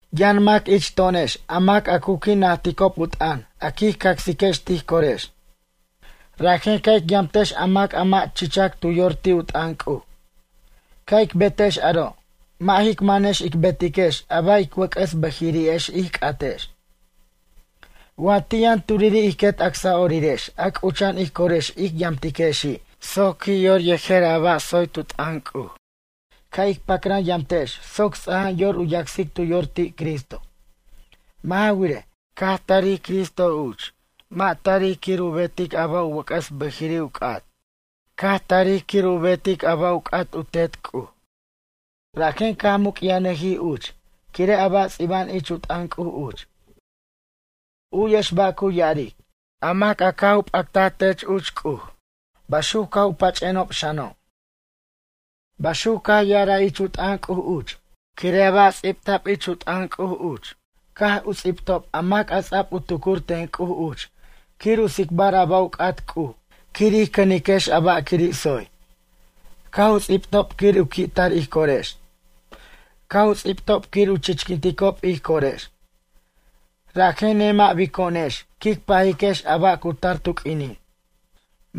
Yʌn mac ich to'onex a mac a cu qui' najticob u t'ʌn, a quij cacsex tij corex. Rajen ca' ic yamtex a mac a mʌ' chichac tu yor ti' u t'ʌn C'uj. Ca' ic betex aro', mʌ' jic manex ic betiquex a ba' ic wʌc'ʌs bʌjiri'ex ij c'atex. Wa ti' yʌn turiri' ij quet acsa'orirex a c'ucha'an ij corex ic yamtiquexi' soc qui' yor yejer a ba' tsoy tu t'ʌn C'uj, ca' ic pacran yamtex soc ts'a'ajan yor u yacsic tu yor ti' Cristo. Mʌ' ja wirej, caj tarij Cristo uch, mʌ' tarij quir u betic a ba' u wʌc'ʌs bʌjiri' u c'at. Caj tarij quir u betic a ba' u c'at u Tet C'uj. Rajen caj muc'yajnʌjij uch, quire' a ba' ts'iba'an ich u t'ʌn C'uj uch. U'yex ba' cu ya'aric: “A mac a caj p'actaj tech uch, C'uj, baxuc caj u pach'enob xano'.” Baxuc caj ya'araj ich u t'ʌn C'uj uch. Quire' a ba' ts'ibta'b ich u t'ʌn C'uj uch, caj u ts'ibtob a mac a ts'ab u tucur ten C'uj uch quir u tsicbar a ba' u c'at C'uj quir ij cʌniquex a ba' quiri' tsoy. Caj u ts'ibtob quir u qui'tar ij corex. Caj u ts'ibtob quir u chichquinticob ij corex. Rajen nemʌ'bico'onex quic pajiquex a ba' cu tar tu q'uinin.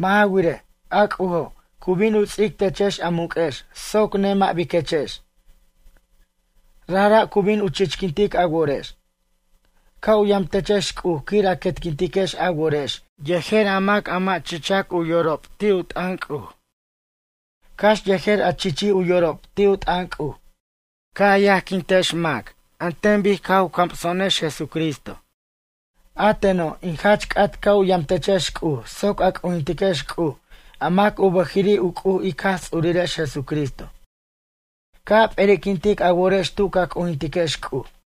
Mʌ' ja wirej, a C'ujo', cu bin u ts'ic techex a muq'uex soc nemʌ'biquechex. Rajra' cu bin u chichquintic a worex. Ca' u yamtechex C'uj quir a quetquintiquex a worex yejer a mac a mʌ' chichac u yorob ti' u t'ʌn C'uj, cax yejer a chichij u yorob ti' u t'ʌn C'uj. Ca' a yajquintex mac an ten bic caj u camso'onex Jesucristo. A teno', in jach c'at ca' u yam techex C'uj soc a c'ujintiquex C'uj a mac u bʌjiri' u C'uj ic Jaj Ts'urirex Jesucristo. Ca' a p'eri'quint a worex tu ca c'ujintiquex C'uj.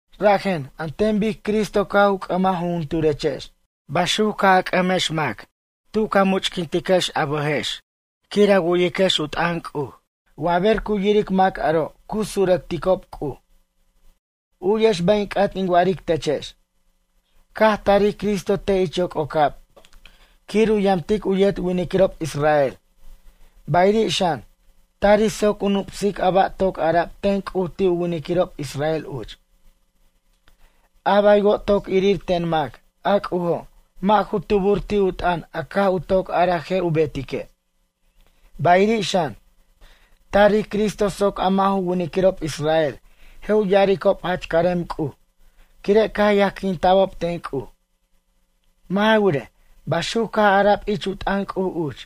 Rajen, an ten bic Cristo caj u c'ʌmaj jujuturechex, baxuc ca' a c'ʌmex mac tu ca much'quintiquechex quir a wu'yiquex u t'ʌn C'uj. Wa ber cu yiric mac aro' cu surʌcticob C'uj. U'yex ba' in c'at in wa'aric techex. Caj tarij Cristo te' ich yoc'ocab quir u yamtic u yet winiquirob israel. Bayiri' xan, tarij soc u nup'sic a ba' toc ara'b ten C'uj ti' u winiquirob israel uch. A baywo' toc irir ten mac, a C'ujo', mʌ' ju tubur ti' u t'ʌn a caj u toc araj je' u betique'. Bayiri' xan, tarij Cristo soc a mʌ' ju winiquirob israel je' u ya'aricob jach carem C'uj, quire' caj yajquinta'bob ten C'uj. Mʌ' ja wirej, baxuc caj ara'b ich u t'ʌn C'uj uch: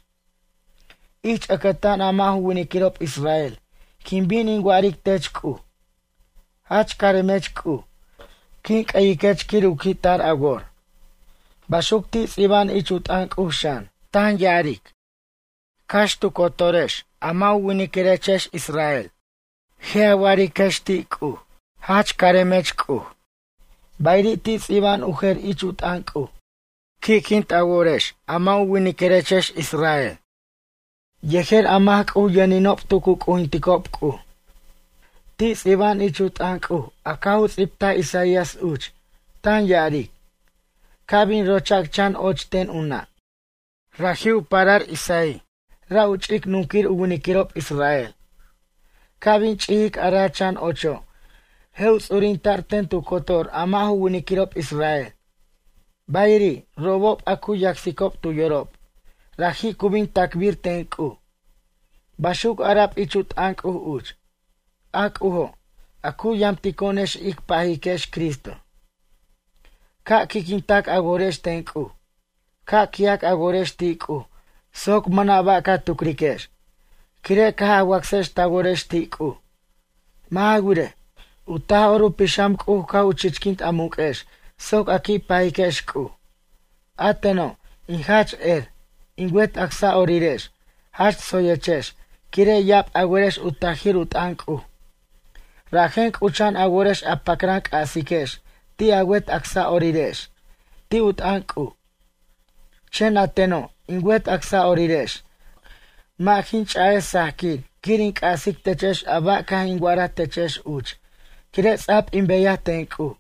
Ich ʌcʌtan a mʌ' ju winiquirob israel quin bin in wa'aric tech C'uj: Jach caremech C'uj, quin c'ʌyiquech quir u qui'tar a wor. Baxuc ti' ts'iba'an ich u t'ʌn C'uj xan, tan ya'aric: Cax tu cotorex a mʌ' ju winiquirechex israel, je' a wa'ariquex ti' C'uj: Jach caremech C'uj. Bayiri' ti' ts'iba'an u jer ich u t'ʌn C'uj: Qui'quint a worex a mʌ' ju winiquirechex israel yejer a mac C'uj yʌninob tu cu c'ujincob C'uj. Ti' ts'iba'an ich u t'ʌn C'uj a caj u ts'ibtaj Isaias uch, tan ya'aric: Ca' bin rochac chan och ten u nʌ'. Raji' u parar Jesse, ra' u ch'ic nunquir u winiquirob israel. Ca' bin ch'ijic a ra' chan ocho', je' u ts'urinta'r ten tu cotor a mʌ' ju winiquirob israel. Bayiri', robob a cu yacsicob tu yorob, raji' cu bin tacbir ten C'uj. Baxuc ara'b ich u t'ʌn C'uj uch. A C'ujo', a cu yamtico'onex ic pajiquex Cristo, ca' qui'quintac a worex ten C'uj. Ca' qui'ac a worex ti' C'uj soc mʌna' ba' ca tucriquex, quire' caj a wacsex ta worex ti' C'uj. Mʌ' ja wirej, u Taj'or u Pixam C'uj caj u chichquint a muq'uex soc a qui' pajiquex C'uj. A teno', in jach er, in wet acsa'orirex jach tsoyechex, quire' ya'ab a werex u tajir u t'ʌn C'uj. Rajen c'ucha'an a worex a pacran c'asiquex ti' a wet acsa'orirex ti' u t'ʌn C'uj. Chen a teno', in wet acsa'orirex, mʌ' jin ch'a'ej sajquir quir in c'asic techex a ba' caj in wa'araj techex uch, quire' ts'a'b in beyaj ten C'uj.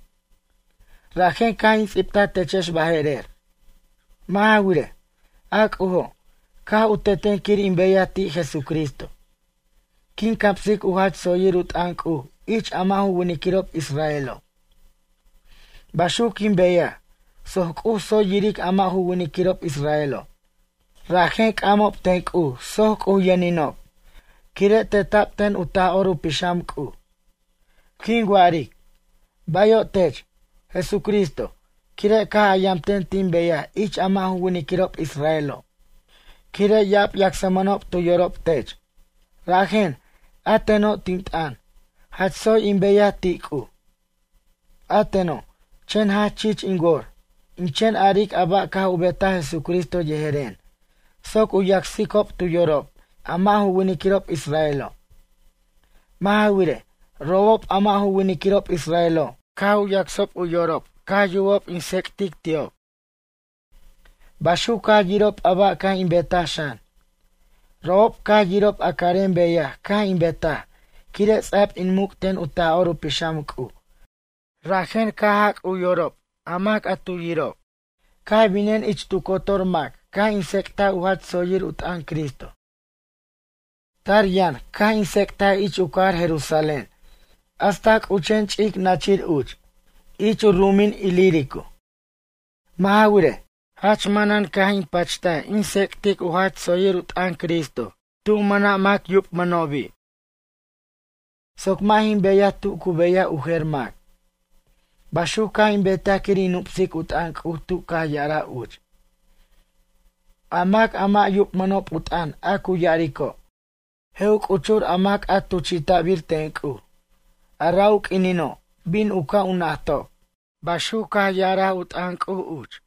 Rajen caj in ts'ibta techex baje'rer. Mʌ' ja wirej, a C'ujo', caj u teten quir in beyaj ti' Jesucristo. Quin camsic u jach tsoyir u t'ʌn C'uj ich a mʌ' ju winiquirob israelo'. Baxuc quin beyaj, soc C'uj tsoy yiric a mʌ' ju winiquirob israelo'. Rajen c'amob ten C'uj soc C'uj yʌninob, quire' teta'b ten u Taj'or u Pixam C'uj. Quin wa'aric: “Bayo' tech, Jesucristo, quire' caj a yamten tin beyaj ich a mʌ' ju winiquirob israelo', quire' ya'ab yacsmʌnob tu yorob tech.” Rajen, a teno' tin t'ʌn, jach tsoy in beyaj ti' C'uj. A teno', chen jach chich in wor, in chen aric a ba' caj u betaj Jesucristo yejeren, soc u yacsicob tu yorob a mʌ' ju winiquirob israelo'. Mʌ' ja wirej, robob a mʌ' ju winiquirob israelo', caj u yacsob u yorob caj yubob in tsec'tic ti'ob. Baxuc caj yirob a ba' caj in betaj xan. Robob caj yirob a carem beyaj caj in betaj, quire' ts'a'b in muc' ten u Taj'or u Pixam C'uj, rajen caj u jac' u yorob a mac a tu yirob. Caj binen ich tu cotor mac caj in tsec'taj u jach tsoyir u t'ʌn Cristo. Tar yʌn, caj in tsec'taj ich u cajar Jerusalén hasta c'uchen ch'ic nachir uch, ich u ru'umin Ilírico. Mʌ' ja wirej, jach manan caj in pacht in tsec'tic u jach tsoyir u t'ʌn Cristo tu mʌna' mac yubmʌnobi', soc mʌ' jin beyaj tu cu beyaj u jer mac. Baxuc caj in betaj quir in nup'sic u t'ʌn C'uj tu caj ya'araj uch: A mac a mʌ' yubmʌnob u t'ʌn a cu ya'arico', je' u c'uchur a mac a tuchi'ta'bir ten C'uj. A ra' u q'uinino' bin u ca' u najtob. Baxuc caj ya'ar u t'ʌn C'uj uch.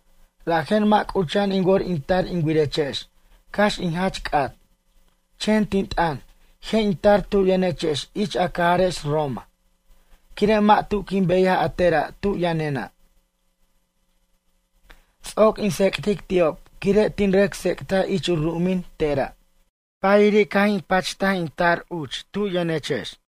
Rajen mʌ' c'ucha'an in wor in tar in wirechex cax in jach c'at. Chen tin t'ʌn, je' in tar tu yʌnechex ich a cajarex Roma, quire' mʌ' tu quin beyaj a tera' tu yʌnena'. Ts'oc in tsec'tic ti'ob quire' tin rʌc tsec'taj ich u ru'umin tera'. Bayiri' caj in pacht in tar uch tu yʌnechex.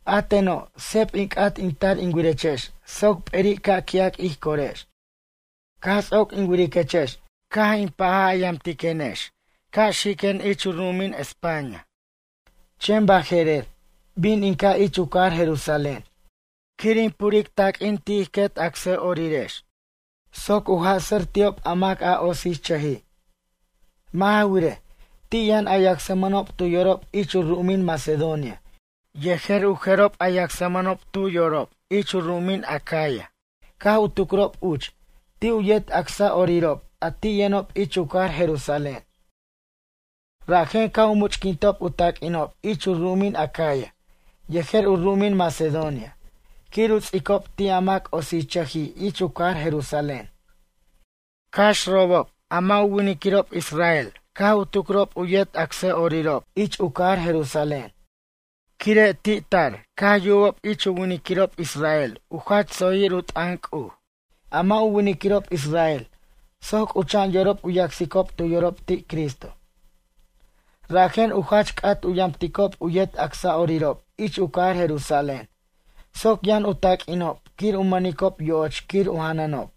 A teno', seb in c'at in tar in wirechex soc p'eri' ca' qui'ac ij corex. Caj ts'oc in wiriquechex caj paj a yamtiquenex ca' xiquen ich u ru'umin España. Chen baje'rer, bin in ca' ich u cajar Jerusalén quir in pure ti' ij quet acsa'orirex, taq'uin soc u jasʌ'r ti'ob a mac otsichʌjij. Mʌ' ja wirej, ti' yʌn a yacsmʌnob tu yorob ich u ru'umin Macedonia yejer u jerob yacsmʌnob tu yorob ich u ru'umin Acaya, caj u tucrob uch, ti' u yet acsa'orirob a ti' yʌnob ich u cajar Jerusalén. Rajen caj u much'quintob u taq'uinob ich u ru'umin Acaya, yejer u ru'umin Macedonia quir u ts'icob ti' a mac otsichʌjij ich u cajar Jerusalén. Cax robob, mʌ' ju winiquirob israel caj u tucrob u yet acsa'orirob ich u cajar Jerusalén. Quire' ti' tar caj yubob ich u winiquirob israel u jach tsoyir u t'ʌn C'uj, a mʌ' u winiquirob israel soc c'ucha'an yorob u yacsicob tu yorob ti' Cristo. Rajen u jach c'at u yamticob u yet acsa'orirob ich u cajar Jerusalén soc yʌn u taq'uinob quir u mʌnicob yo'och quir u janʌnob.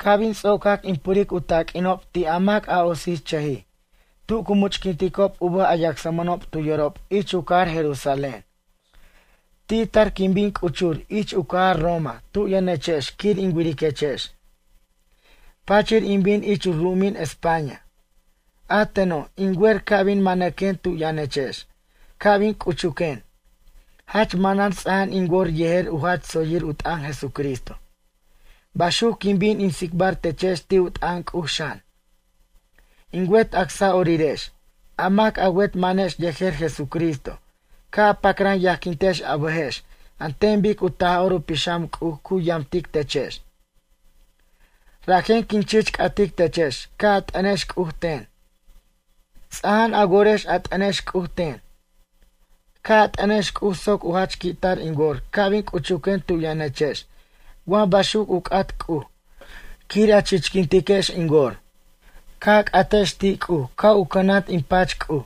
Ca' bin ts'ocac in puric u taq'uinob ti' a mac otsichʌjij, tu cu much'quinticob u bʌj a yacsmʌnob tu yorob ich u cajar Jerusalén. Ti' tar quin bin c'uchur ich u cajar Roma tu yʌnechex quir in wiriquechex. Pachir in bin ich u ru'umin España. A teno', in wer ca' bin manʌquen tu yʌnechex, ca' bin c'uchuquen, jach manan ts'aja'an in wor yejer u jach tsoyir u t'ʌn Jesucristo. Baxuc quin bin in tsicbar techex ti' u t'ʌn C'uj xan. In wet acsa'orirex, a mac a wet manex yejer Jesucristo, ca' a pacran yajquintex a bʌjex an ten bic u Taj'or u Pixam C'uj cu yamtic techex. Rajen quin chich c'atic techex ca' a t'ʌnex C'uj ten. Ts'aja'an a worex a t'ʌnex C'uj ten. Ca' a t'ʌnex C'uj soc u jach qui'tar in wor ca' bin c'uchuquen tu yʌnechex wa baxuc u c'at C'uj, quir a chichquintiquex in wor. Ca' a c'atex ti' C'uj ca' u cʌnant in pach C'uj,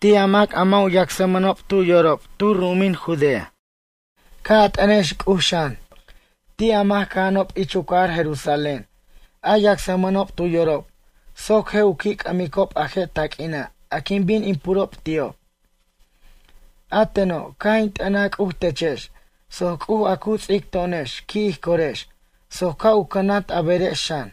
ti' a mac a mʌ' yacsmʌnob tu yorob tu ru'umin Judea. Ca' a t'ʌnex C'uj xan, ti' a mac cʌja'anob ich u cajar Jerusalén, a yacsmʌnob tu yorob, soc je' u qui' c'ʌmicob a je' taq'uina' a quin bin in purob ti'ob. A teno', caj in t'ʌnaj C'uj techex, soc C'uj a cu ts'ic to'onex qui' ij corex, soc ca' u cʌnant a berex xan.